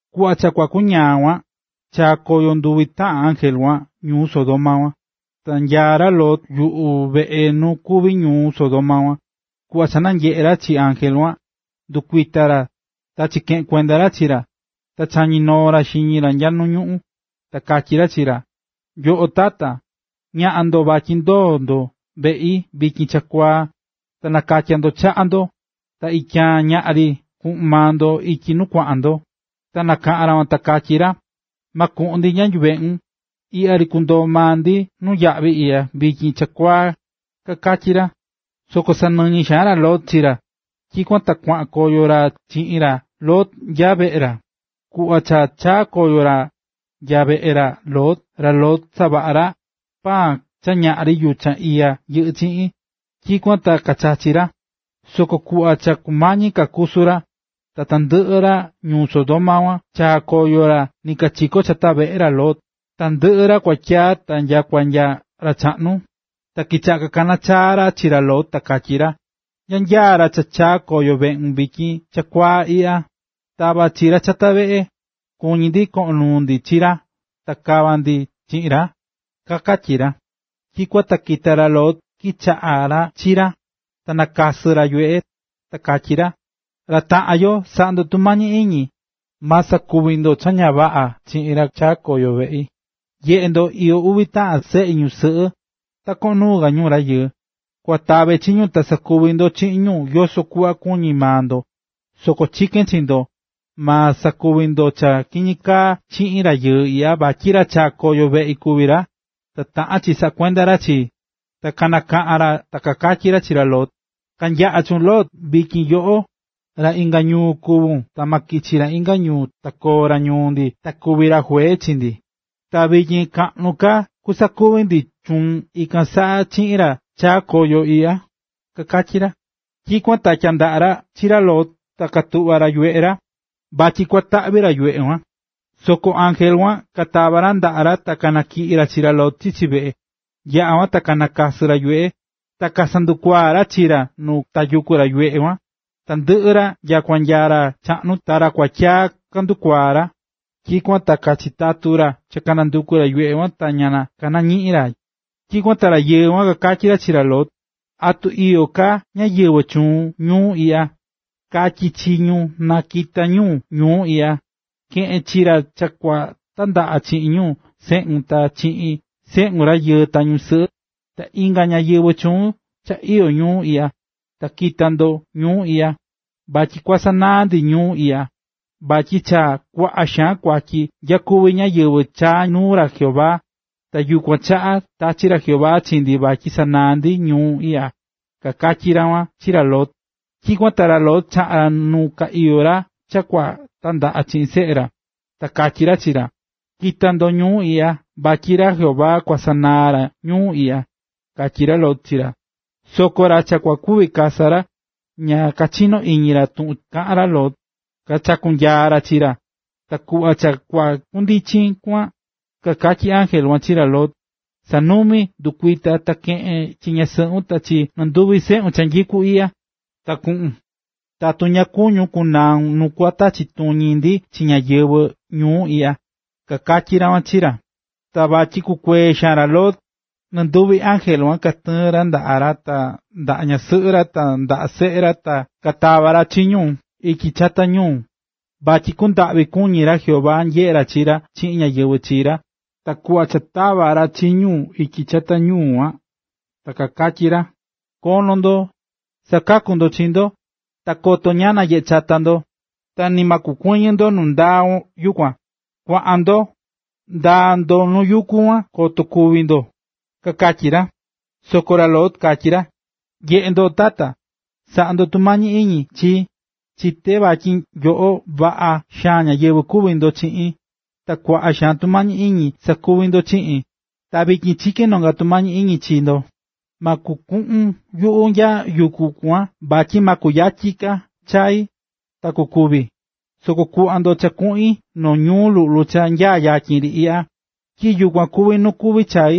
Kuꞌva cha kua kuñaa kuan, chaa̱ koyo nduvi taꞌan ángel kuan ñuu Sodoma kuan. Ta nyaá ra Lot yuꞌu veꞌe nu kuví ñuu Sodoma kuan. Kuꞌva cha nanyeꞌe̱ ra chi ángel kuan, ndɨkuita̱ ra ta chikeꞌe̱n kuenda ra chi ra. Ta chañi̱ noo ra xiñi ra nya nu ñuꞌún. Ta katyí ra chi ra: ―Nyoꞌo Tata, ñaꞌan ndo vatyi ndoo ndo veꞌi vityin chakuaa, ta na katya ndo chaꞌa ndo. Ta ityaan ñaꞌan ri kuꞌun maa ndo ityi nu kuaꞌan ndo. Ta kanakaꞌa̱n ra kuan ta kakatyí ra: ―Ma kuꞌun ndi nya yuveꞌun, iꞌya ri kundoo maa ndi nuyaꞌvi iꞌya vityin chakuaa ―kakatyí ra. Soko sanɨñɨ xaan ra Lot chi ra. Tyikuan ta kuaꞌan koyo ra chiꞌin ra Lot nya veꞌe ra. Kuꞌva cha chaa̱ koyo ra nya veꞌe ra Lot, ra Lot savaꞌa̱ ra paan cha ñaꞌri yuchan iya yɨꞌɨ́ chiꞌin, tyikuan ta kachachi̱ ra. Soko kuꞌva cha kumañi ka kusu ra, ta tandɨꞌɨ ra ñuu Sodoma kuan chaa koyo ra nikachiko chata veꞌe ra Lot, tandɨꞌɨ ra kuatyi ta nyakua nya ra chaꞌnu. Ta kichaꞌa̱ kakaná chaa ra chi ra Lot ta katyí ra: ―¿Nya nyaá ra cha chaa̱ koyo veꞌun vityin chakuaa iꞌya? ¡Ta̱va chi ra chata veꞌe! ¡Kuñí ndi koꞌon nuu ndi chi ra ta kava ndi chiꞌin ra! ―kakatyí ra. Tyikuan ta kita̱ ra Lot chikaꞌa̱n ra chiꞌin ra, ta nakasɨ̱ ra yuveꞌe. Ta katyi ra: ―Ra taꞌan yo, sa̱ꞌa ndo tumañi iñi, ma sakuvi ndo cha ña vaꞌa chiꞌin ra cha chaa̱ koyo veꞌi. Nye̱ꞌe ndo, iyó uvi taꞌan seꞌi ñusɨꞌɨ, ta koꞌon nuu ka ñu rayɨɨ. Kua tave chi ñu, ta sakuvi ndo chiꞌin ñu yoso kuꞌva kuñí maa ndo. Soko chikén chi ndo, ma sakuvi ndo cha kiñi kaa chiꞌin rayɨɨ iꞌya vatyi ra chaa̱ koyo veꞌi kuví ra, ta taꞌán chi saꞌakuende chi ra. Ta kanakaꞌa̱n ra ta kakatyí ra chi ra Lot: ―¡Ka̱nyaꞌa chuun, Lot! Vityin yoꞌo, ra inga ñuu kuvún ta ma kichi ra inga ñuu ta koo ra ñuu ndi ta kuvi ra juee chi ndi. Ta vityin kaꞌnu ka cha kusakuvi ndi chuun ikan saꞌa chi ra cha chaa koyo iꞌya ―kakatyí ra. Tyikuan ta tyandaꞌa̱ ra chi ra Lot ta katuꞌva̱ ra yuveꞌe, vatyi kua taꞌvi ra yuveꞌe kuan. Soko ángel kuan katava̱ ra ndaꞌa ra ta kanatyiꞌi̱ ra chi ra Lot chichi veꞌe. Yaꞌa̱ kuan ta kanakasɨ̱ ra yuveꞌe. Ta kasandukuaa̱ ra chi ra nu tayukú ra yuveꞌe kuan, tandɨꞌɨ ra nyakua nya ra chaꞌnu ta ra kuatyi kandukuaa̱ ra. Tyikuan ta kachitatu̱ ra cha kanandukú ra yuveꞌe ta ña kanañiꞌi̱n ra. Tyikuan ta rayɨɨ kuan kakatyí ra chi ra Lot: ―¿Atu iyó ka ñáyɨvɨ chuun ñuu iꞌya? Ka̱tyi chi ñu na kakita ñu ñuu iꞌya. Ke̱ꞌen chi ra cha kua tandaꞌa chiꞌin ñu seꞌun ta chi seꞌun rayɨɨ ta ñusɨꞌɨ, ta inga ñáyɨvɨ chuun cha iyó ñuu iꞌya, ta ki̱ta ndo ñuu iꞌya. Vatyi kua sanaa ndi ñuu iꞌya, vatyi cha kuaꞌa xaan kuatyi nyakuví ñáyɨvɨ chaá nuu ra Jehová, ta yukuan chaꞌa tachi̱ ra Jehová chi ndi vatyi sanaa ndi ñuu iꞌya ―kakatyí ra kuan chi ra Lot. Tyikuan ta ra Lot chaꞌa̱n ra nu ka iyó ra cha kua tandaꞌa chiꞌin seꞌe ra, ta katyí ra chi ra. ―¡Ki̱ta ndo ñuu iꞌya vatyi ra Jehová kua sanaa ra ñuu iꞌya! ―katyí ra Lot chi ra. Soko ra cha kua kuvi kasa ra, ña kachinó iñi ra tuꞌun kaꞌán ra Lot, kachakú nyaa ri ra. Ta kuꞌva cha kua kundichin kuan, kakatyí ángel kuan chi ra Lot: ―!Sa̱numi¡, ndɨ̱kuita ta keꞌe̱n chi ñasɨꞌun ta chi nɨnduvi seꞌun cha nyikú iꞌya, ta ku̱ꞌun, tatu ña kuñún kunaun nu kua tachi tuñi ndi chi ñáyɨvɨ ñuu iꞌya ―kakatyí ra chi ra. Ta vatyi kukuee xaan ra Lot, nɨnduvi ángel kuan katɨɨ̱n ra ndaꞌa ra ta ndaꞌa ñasɨꞌɨ ra ta ndaꞌa seꞌe ra ta katava̱ ra chi ñu ityi chata ñuu, vatyi kundaꞌvi kuñí ra Jehová nyeꞌé ra chi ra chiꞌin ñáyɨvɨ chi ra. Ta kuꞌva cha tava̱ ra chi ñu ityi chata ñuu kuan, ta kakatyí ra: ―¡Ko̱no ndo, sa̱kaku ndo chi ndo! Ta koto ñaꞌan nanyeꞌe chata ndo, ta ni ma kukuɨñɨ ndo nu ndaa yukuan. Kua̱ꞌan ndo, ndaa ndo nuu yuku kuan koto kúvi ndo ―kakatyí ra. Soko ra Lot katyí ra: ―Nye̱ꞌe ndo, tata, sa̱ꞌa ndo tumañi iñi chii, chité vatyi nyoꞌo vaꞌa xaan ñáyɨvɨ kuví ndo chiꞌin, ta kuaꞌa xaan tumañi iñi sakuví ndo chiꞌin. Ta vityin chikén nonga tumañi iñi chi ndo, ma kuvi kuꞌun yuꞌu nya yuku kuan vatyi ma kuyatyi ka chai, ta kukúvi. Soko kuꞌva ndo cha kuꞌin noo ñuu luꞌlu cha nya yatyin ri iꞌya, tyi yukuan kuví nu kuvi chai,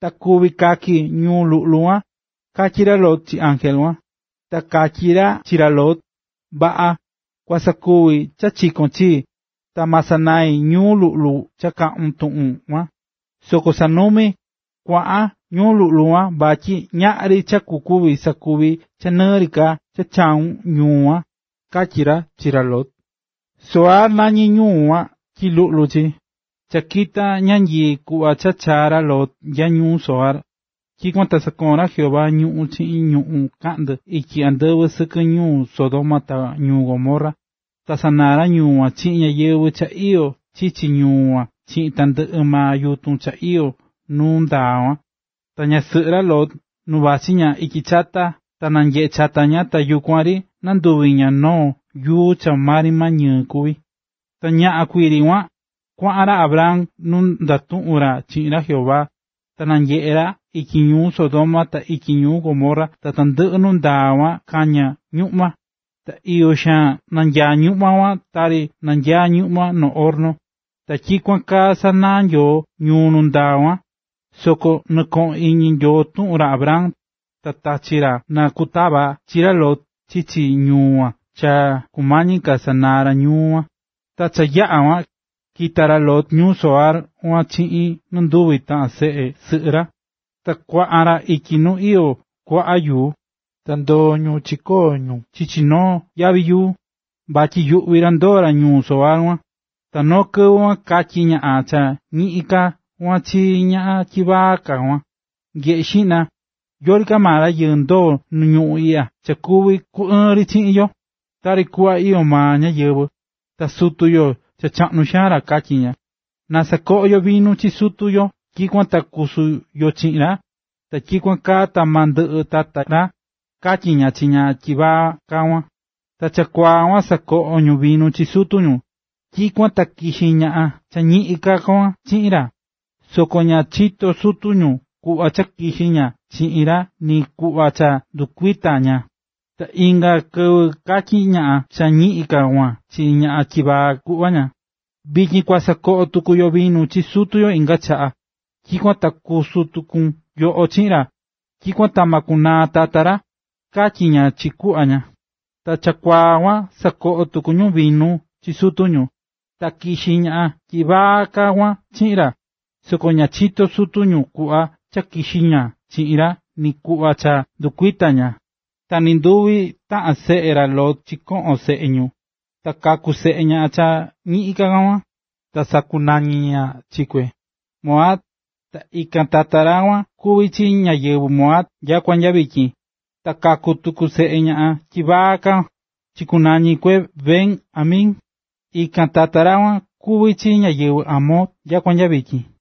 ta kuvi kaki ñuu luꞌlu kuan ―katyí ra Lot chi ángel kuan. Ta katyí ra chi ra Lot: ―Vaꞌa, kua sakuvi cha chikón chii, ta ma sanai ñuu luꞌlu cha kaꞌún tuꞌun kuan. Soko sa̱numi, kua̱ꞌan ñuu luꞌlu kuan vatyi ñaꞌri cha kuvi sakuvi cha ñɨɨ rɨ ka cha ta chaa kon ñuu kuan ―katyí ra chi ra Lot. Zoar nañí ñuu kuan tyi luꞌlu chi. Cha kita̱ ñanyii kuꞌva cha chaa̱ ra Lot nya ñuu Zoar. Tyikuan ta sakoo̱n ra Jehová ñuꞌu̱n chiꞌin ñuꞌu̱n kaꞌndɨ ityi andɨvɨ sɨkɨ ñuu Sodoma ta ñuu Gomorra. Ta sanaa̱ ra ñuu kuan chiꞌin ñáyɨvɨ cha iyó chichi ñuu kuan chiꞌin tandɨꞌɨ maa yutun cha iyó nuu ndaa kuan. Ta ñasɨꞌɨ ra Lot, nu vachí ña ityi chata, ta nanyeꞌe̱ chata ña, ta yukuan ri nanduvi̱ ña noo yuu cha maa ri ñɨɨ kuví. Ta ñaꞌan kuii ri kuan, kuaꞌan ra Abraham nu ndatuꞌu̱n ra chiꞌin ra Jehová. Ta nanyeꞌe̱ ra ityi ñuu Sodoma ta ityi ñuu Gomorra ta tandɨꞌɨ nu ndaá kuan kañá ñuꞌma. Ta iyo xaan nanyaá ñuꞌma kuan tari nanyaá ñuꞌma noo horno. Ta tyikuan kaa sanaa̱ Nyoo ñuu nu ndaa kuan, soko nɨkoꞌo̱n iñi Nyoo tuꞌun ra Abraham, ta tachi̱ ra na kutava chi ra Lot chichi ñuu kuan cha kumañi ka cha sanaa ra ñuu kuan. Ta cha yaꞌa̱ kuan, kita̱ ra Lot ñuu Zoar kuan chiꞌin nɨnduvi taꞌan seꞌe sɨꞌɨ ra, ta kuaꞌan ra ityi nu iyó kuaꞌa yuku, ta ndoo̱ ñu chikoo̱ ñu chichi noo yavi yuu, vatyi yuꞌví ra ndoo ra ñuu Zoar kuan. Ta noo kɨvɨ kuan katyí ñaꞌan cha ñiꞌin ka kuan chi ñaꞌan tyivaa ka kuan: ―Nye̱ꞌe xiꞌna, yori ka maa rayɨɨ ndoo̱ nu ñuꞌún iꞌya cha kuvi ku ɨɨn ri yo chiꞌin, tari kuꞌva iyó maa ñáyɨvɨ, ta sutu yo cha chaꞌnu xaan ra ―katyí ña―. Na sakoꞌo yo vinu chi sutu yo tyikuan ta kusu yo chiꞌin ra, ta tyikuan kaa ta ma ndɨꞌɨ tata ra ―katyí ña chi ñaꞌan cha tyivaa ka kuan. Ta chakuaa kuan sakoꞌo̱ ñu vinu chi sutu ñu. Tyikuan ta kixi̱ ñaꞌan cha ñiꞌin ka kuan chiꞌin ra, soko ña chito̱ sutu ñu kuꞌva cha kixi̱ ña chiꞌin ra ni kuꞌva cha ndɨkuita̱ ña. Ta inga kɨvɨ katyí ñaꞌan cha ñiꞌin ka kuan chi ñaꞌan tyivaa kuꞌu ña: ―Vityin yuꞌu cha yaꞌa̱ kixi̱ chiꞌin ra kuñi. Vityin kua sakoꞌo tuku yo vinu chi sutu yo inga chaꞌa, tyikuan ta kusu tuku yoꞌo chiꞌin ra. Tyikuan ta ma kunaa tata ra ―katyí ña chi kuꞌu ña. Ta chakuaa kuan sakoꞌo̱ tuku ñu vinu chi sutu ñu, ta kixi̱ ñaꞌan tyivaa ka kuan chiꞌin ra, soko ña chito̱ sutu ñu kuꞌva cha kixi̱ ña chiꞌin ra ni kuꞌva cha ndɨkuita̱ ña. Ta nɨnduvi taꞌan seꞌe ra Lot chikoꞌo̱n seꞌe ñu. Ta kaku̱ seꞌe ñaꞌan cha ñiꞌin ka kuan, ta sakunañi̱ ña chi kue, Moab, ta ikan tata ra kuan kuví chi ñáyɨvɨ Moab nyakua nya vityin. Ta kaku̱ tuku seꞌe ñaꞌan tyivaa ka kuan, ta chikunañi̱ kue Ben-ammi, ikan tata ra kuan kuví chi ñáyɨvɨ Amon nyakua nya vityin.